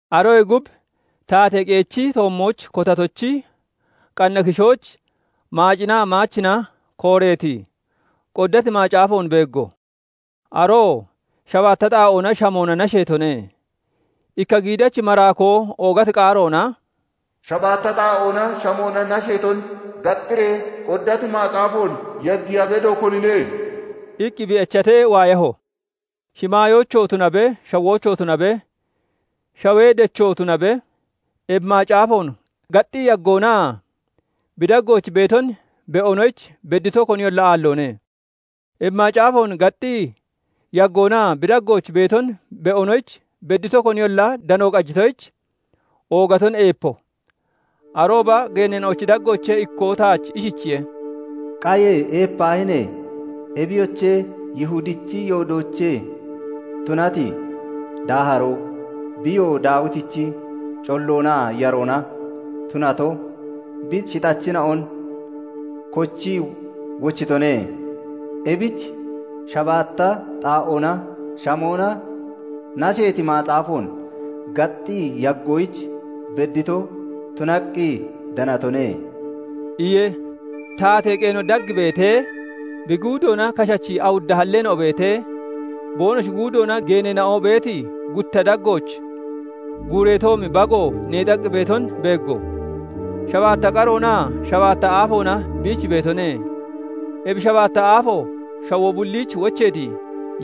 Aroyee gub taatee qeechi toommooch kotatochi qanna kishooch maacinaa maachina kooreeti, qoddati macaafoon beeggo; aroo shabaatta xaa'oona shamoona nasheetone. Ikka giidachi maraakoo oogati qaaroona "Shabaatta xaa'oona shamoona nasheeton gaxxiree, qoddati macaafoon yaggiya bedo, konine?" iqqi bi echatee waayaho. Shimaayoochoo tunabe, shawoochoo tunabe, shawee dechoo tunabe, ebi macaafoon gaxxii yaggoonaa bi daggooch beeton be'onoyich beddito koniyolla aalloone. Ebi macaafoon gaxxii yaggoonaa bi daggooch beeton be'onoyich beddito koniyolla dano qajitoyich, oogaton eepo. Arooba geeneena'ochi daggoochee ikkoo taach ishichiye:- "Qaye! Eepaahine! Ebiyoche, Yihudichi yoodoochee tunati daaharoo, biyoo Daawitichi colloonaa yaroona tunato bi shixachina'on kochii wochitone; ebich shabaatta xaa'oona shamoona nasheeti macaafoon gaxxii yaggoyich beddito tunaqqi danatone" iye. Taatee qeeno dag beetee, bi guudoona kashachi awudda halleena'o beetee, boonoshi guudoona geeneena'o beeti gutta daggooch guureetoomi Bago neexaqqi beeton beeggo; shabaatta qaroonaa shabaatta aafoona biich beetone; ebi shabaatta aafo shawoo bulliich wocheeti,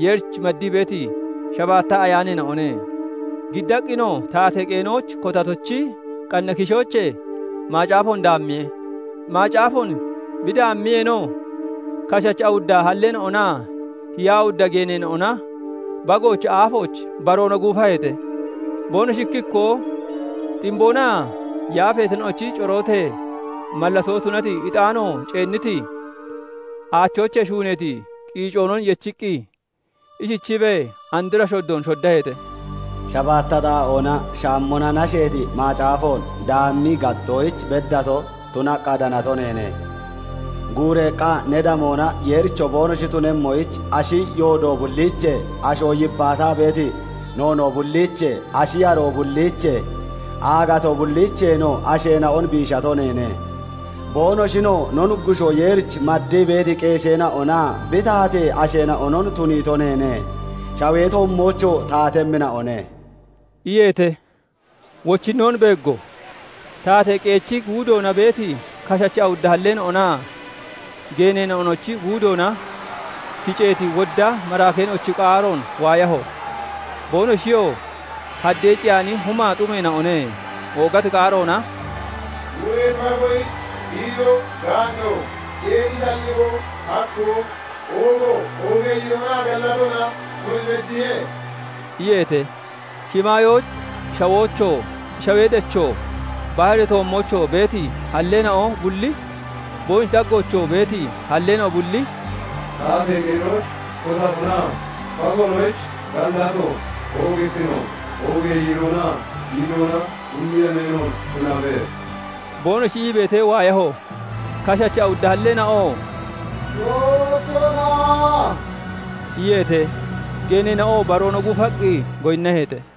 Yeerich maddii beeti shabaatta ayaaneena'one. Giddaqqinoo taatee qeenooch kotatochi qanna kishoochee macaafoon daammiye. Macaafoon bi daammiyeenoo, kashachi awudda halleena'onaa hiyaa awudda geeneena'ona Bagoochi aafooch baroona guufaheete. Boonoshi ikki ikkoo ximboonaa yaafeena'ochi corootee mallatoo tunati ixaano ceenniti, aachoochee shuuneeti qiicoonon yechiqqi, ishichiibee andra shoddoon shoddaheete:- S"habaatta xaa'oona shamoona nasheeti macaafoon daammii gaxxoyich beddato tunaqqa danato neene; guureeqqa ne damoona Yeericho boonoshi tunemmoyich, ashi yoodo bulliichee, asho yibbaataa beeti noonoo bulliichee, ashi yaroo bulliichee, aagatoo bulliicheenoo asheena'on biishato neene; boonoshinoo no Nuggushoo Yeerich maddii beeti qeesheena'onaa bi taatee asheena'onon tuniito neene; Shawee toommoochoo taatemmina'one" iyeete. Wochinnoon beeggo; taatee qeechi guudoona beeti kashachi awudda halleena'onaa geeneena'onochi guudoona kiceeti wodda maraakeena'ochi qaaroon waayaho; boonoshiyoo haddee ciyaani humaa xumeena'one; oogati qaaroona "Guureeti Bagoyich giidoo, gaanno, ceeni shalligoo, hakkoo, oogo, oogee yiiroonaa gallatoona tun beddiye" iyeete. Shimaayooch, shawoochoo, shawee dechoo, baharee toommoochoo beeti halleena'o bulli, boonoshi daggoochoo beeti halleena'o bulli "Taatee qeenooch kotatonaa Bagoonoyich gallato, oogittino, oogee yiiroonaa giidoona bulli yemeenoon tunabe" boonoshi ii beetee waayaho. Kashachi awudda halleena'oo "Tookkona" iyeete; geeneenoo baroona guufaqqi goyinnaheete.